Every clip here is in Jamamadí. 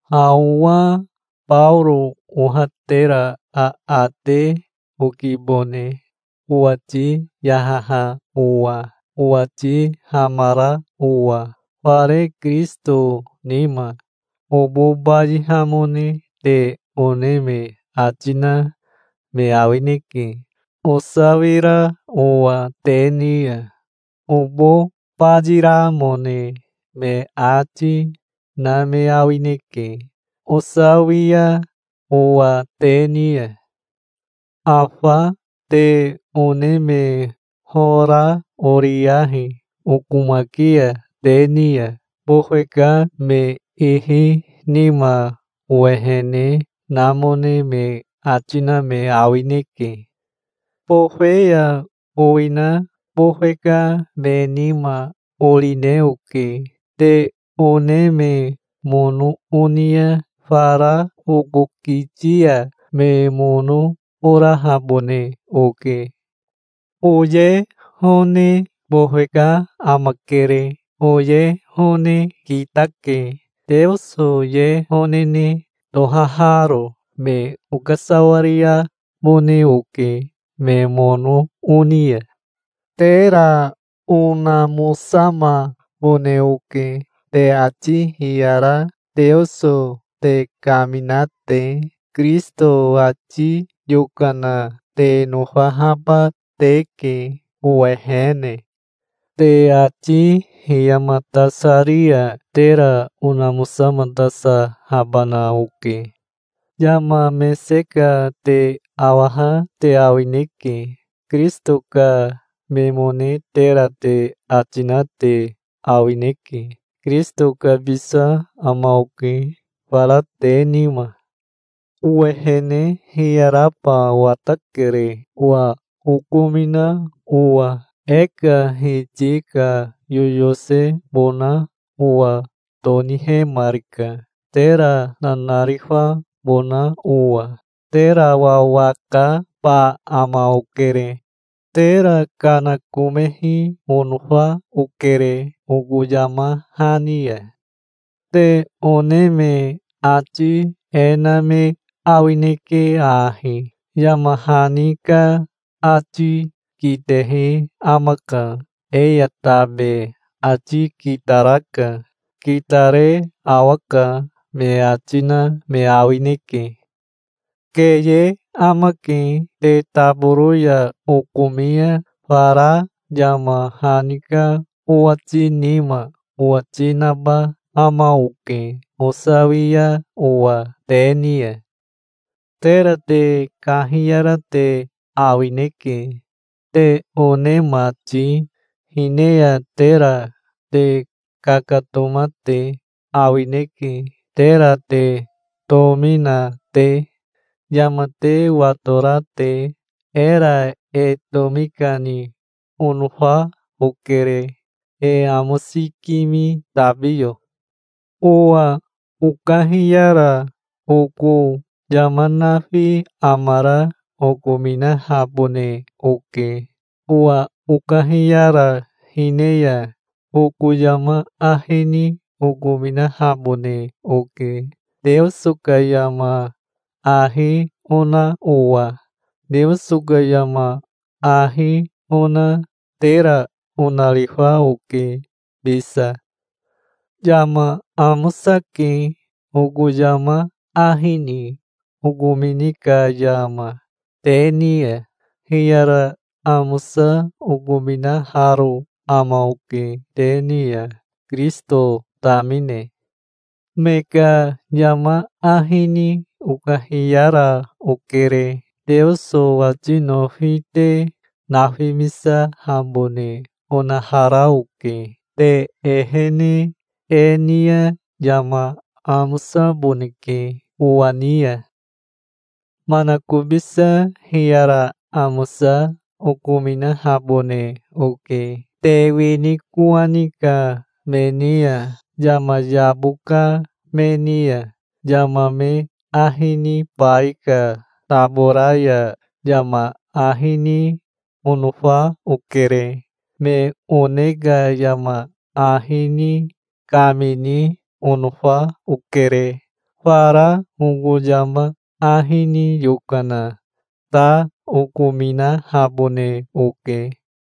Ha owa Baoro oha tera aate okibone, owati yahaha owa, owati hamara owa, fare Kirisito nima. Obo bayihamone te one me ati na me awineke, osawira owa te ni ya. Obo bayiramone me ati, na me awineke, osawia owa te ni ya. Afa te one me hora oriyahi okomaki ya te ni ya. Bofe ka me ihi nima owehene namone me ati na me awineke. Bofe ya owina bofe ka me nima orine oke. Te one me mono oni ya fara oko kiti ya me mono orahabone oke. Oye hone bofe ka amakere. Oye hone kitake, Teoso ye honene tohaharo. Me okasawariabone oke, me mono oni ya. Tera onamosamabone oke, te ati hiyara Teoso te kamina te. Kirisito ati yokana te nofahaba teke owehene. Te ati hiyamatasari ya tera onamosamatasahabana oke. Yama mese ka te awaha te awineke. Kirisito ka memone tera te ati na te awineke. Kirisito kabisa ama oke fara te nima. Owehene hiyaraba watakere, owa okomina owa. E ka Hiti ka yoyosebona owa tonihemarika, tera nanarifabona owa. Tera wawakaba ama okere. Tera kanakomehi onofa okere oko yama hani ya. Te one me ati e na me awineke ahi: "Yama hani ka ati kitehi amaka. E ya tabe ati kitaraka. Kitare awaka", me ati na me awineke. Keye amake. Te taboro ya okomi ya fara yama hani ka owati nima owati naba ama oke osawia owa te ni ya. Tera te kahiyara te awineke, te one mati. Hine ya tera te kakatoma te awineke tera te tomi na te, yama te watora te. Era e tomi kani onofa okere, e amosikimi tabiyo. Owa okahiyara oko yama nafi amara okominahabone oke. Owa okahiyara hine ya oko yama ahi ni okominahabone oke, Teoso ka yama ahi ona owa. Teoso ka yama ahi ona tera onarifa oke bisa. Yama amosake, oko yama ahi ni okomini ka yama, te ni ya. Hiyara amosa okominaharo ama oke te ni ya, Kirisito tamine. Me ka yama ahi ni okahiyara okere. Teoso ati nofi te nafimisahabone onahara oke. Te ehene e ni ya yama amosaboneke owa ni ya. Manakobisa hiyara amosa okominahabone oke te wini kowani ka me ni ya, yama yabo ka me ni ya. Yama me ahi nibai ka tabora ya yama ahi ni onofa okere. Me one ka yama ahi ni kamini onofa okere. Fara oko yama ahi ni yokana ta okominahabone oke.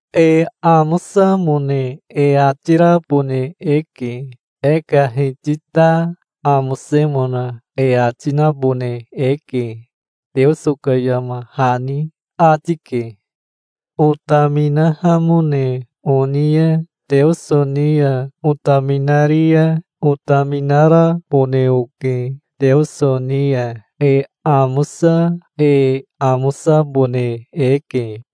"E amosamone e ati rabone eke. E ka Hiti ta amosemona e ati nabone eke", Teoso ka yama hani ati ke. Otaminahamone oni ya Teoso ni ya otaminari ya otaminarabone oke. Teoso ni ya e amosa e amosabone eke.